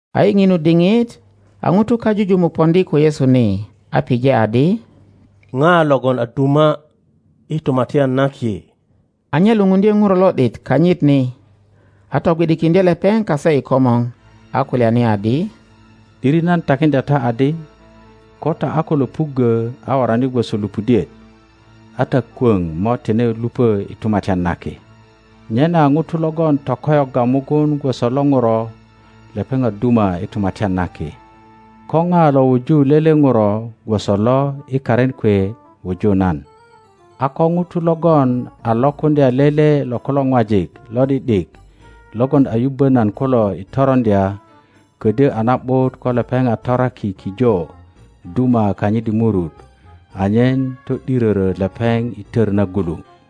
A i ŋinu diŋit a ŋutu kajujumuk poŋdi ko Yesu ni, a pije adi, ŋa logon a duma i Tumatyan na Ki? A nye lupundye ŋuro lo ’dit kanyit ni, a togwi ’dikiŋdye lepeŋ kase i komor, a kulyani adi, ’Diri nan takiŋdya ta adi, ko ta a ko löpuggö a worani gwoso lupudiet, a ta kwöŋ mo tine lupö i Tumatyan na Ki. Nyena ŋuto logon tokoyogga mugun gwoso lo ŋuro, lepeŋ a duma i Tumatyan na Ki. Ko ŋa lo wuju lele ŋuro gwoso lo i karin kwe wuju nan. A ko ŋuto logon a lokuŋdya lele lo kulo ŋwajik lo ’di ’dik logon a yubbö nan kulo i toroŋdya, ködyö a na ’but ko lepeŋ a toraki kijo duma kanyit i murut anyen to ’dirörö lepeŋ i tör nagulu.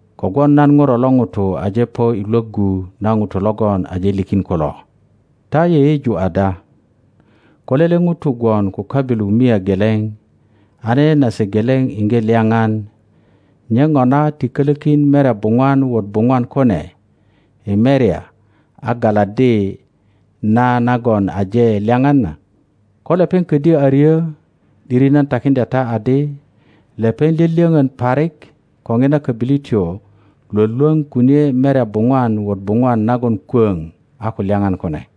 Kogwon nan Ŋuro lo ŋuto aje po i lwöggu na ŋutu logon aje likin kulo.] Ta yeyeju ada? Ko lele ŋuto gwon ko köbilu mia geleŋ, a nene nase geleŋ iŋge lyaŋan, nye ŋona ti kölökin merya buŋwan wot buŋwan kune i merya a galaddi na nagon aje lyaŋan na? Ko lepeŋ ködyö a ryö, ’diri nan takiŋdya ta adi, lepeŋ lyölyöŋön parik ko ŋina kobilityo lwölwöŋ kunie merya buŋwan wot buŋwan nagon kwöŋ a ko lyaŋan kune.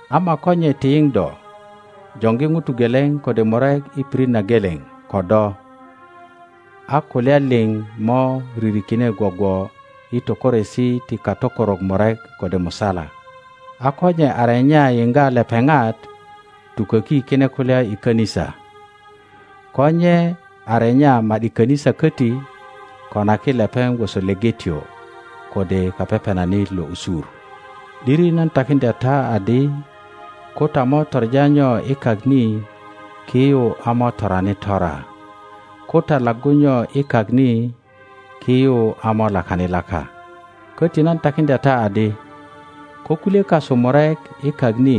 Ama ko nye ti yiŋ do, joŋgi ŋuto geleŋ kode murek i pirit na geleŋ ko do, a kulya liŋ mo ririkine gwogwo i tökoresi ti katökorok murek kode musala. A ko nye a renya yiŋga lepeŋat, tuköki kine kulya i kanisa; ko nye a renya ma ’di kanisa koti, konaki lepeŋ gwoso lepetyo kode kapepenanit lo usur. ’Diri na takiŋdya ta adi, ko ta mo toŋa nyo i kak ni, ki yu a mo torani tora, ko ta laggu nyo i kak ni, ki yu a mo lakani laka. Koti nan takiŋdya ta adi, ko kulye kasu murek i kak ni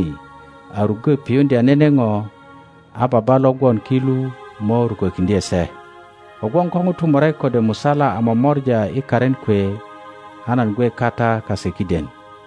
a ruggö piyuŋdya nene ŋo, a Baba lo gwon ki lu mo rukökiŋdye se. Kogwon ko ŋutu murek kode musala a momora i karin kwe a nan gwe kata kase kiden.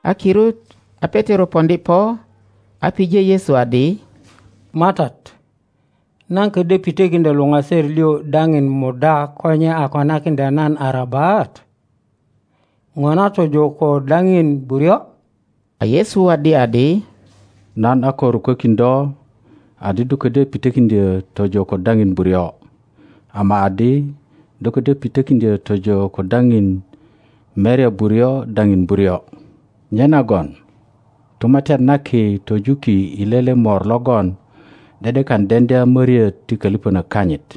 A kirut a Petero poŋdi po a pije Yesu adi, MATAT, nan ködyö pitökiŋdyo luŋaser liŋ daŋin muda ko nye a konakiŋdya nan arabat? Ŋona tojo ko daŋin buryo? a Yesu waddi adi, Nan a ko rukökin do adi do ködyö pitökiŋdyö tojo ko daŋin buryo, ama adi do ködyö pitökiŋdyö tojo ko daŋin merya buryo daŋin buryo. Nyenagon Tumatyan na Ki tojuki i lele mor logon ’de ’dekan deŋdya möriöt ti kölipönök kanyit.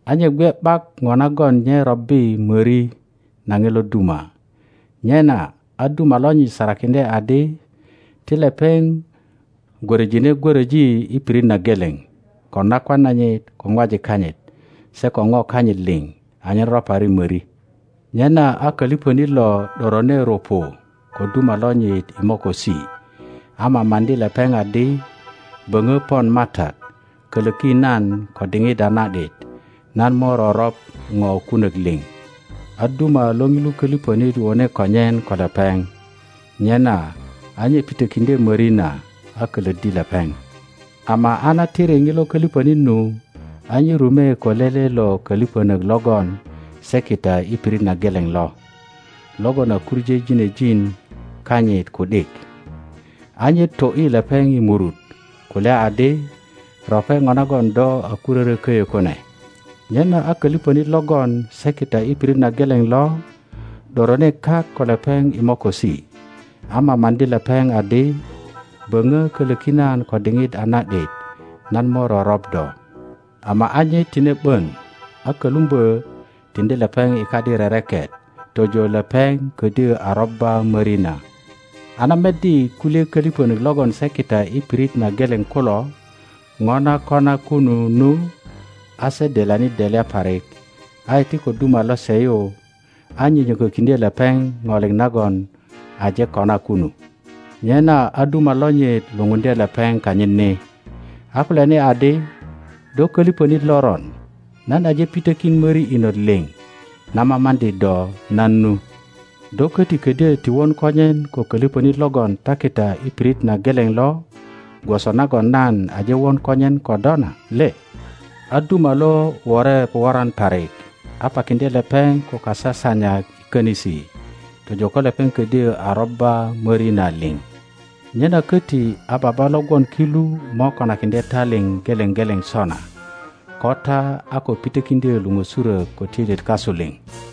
a nye gwe ’bak ŋo nagon nye robbi möri na ŋilo duma, nyena a duma lonyit sarakiŋdye adi ti lepeŋ gwöröjine gwöröji i pirit na geleŋ ko nakwan nanyit, ko ŋwajik kanyit, se ko ŋo kanyit liŋ, anyen ropari möri. Nyena a kölipönit lo ’dojone rupu ko duma lonyit i mokosi, a mamaŋdi lepeŋ adi, Böŋö pon matat, kölöki nan ko diŋit a na ’dit, nan mo roröŋ ŋo kunök liŋ. a duma lo ŋilu kölipönit wone konyen ko lepeŋ, nyena a nye pitökiŋdye möri na, a kölöddi lepeŋ. Ama a na tiri ŋilo kölipönit nu, a nye rume ko lele lo köliponok logon se kita i pirit na geleŋ lo, logon a kuŋö ginejin kanyit ku ’dik. A nye to ’yi lepeŋ i murut kulya adi, Rope ŋo nagon do a kurörö köyö kune. Nyena a kölipönit logon se kita i pirit na geleŋ lo, ’dorone kak ko lepeŋ i mokosi, a mamaŋdi lepeŋ adi, Böŋö kölöki nan ko diŋit a na ’dit, nan mo roröŋ do. Ama a nye tine ’bön, a kölumbö tiŋdi lepeŋ i kadi rereket tojo lepeŋ ködyö a robba möri na. A na meddi kulye kölipönök logon se kita i pirit na geleŋ kulo ŋo na kona kunu nu, a se delyani delya parik, a iti ko duma lose yu, a nyönyökökiŋdye lepeŋ ŋo liŋ nagon aje kona kunu. Nyena a duma lonyit lupundye lepeŋ kanyit ni, a kulyani adi, Do kölipönit loron! Nan aje pitökin möri inot liŋ na mamaŋdi do nan nu. Do köti ködyö ti won konyen ko kölipönit logon ta kita i pirit na geleŋ lo, gwoso nagon nan aje won konyen ko do na le? A duma lo wore woran parik, a pakiŋdye lepeŋ ko kasasanyak i könisi, tojo ko lepeŋ ködyö a robba möri na liŋ. Nyena köti a Baba lo gwon ki lu mo konakiŋdye ta liŋ geleŋ geleŋ sona, ko ta a ko pitökiŋdyö luŋösurök ko töilyet kasu liŋ.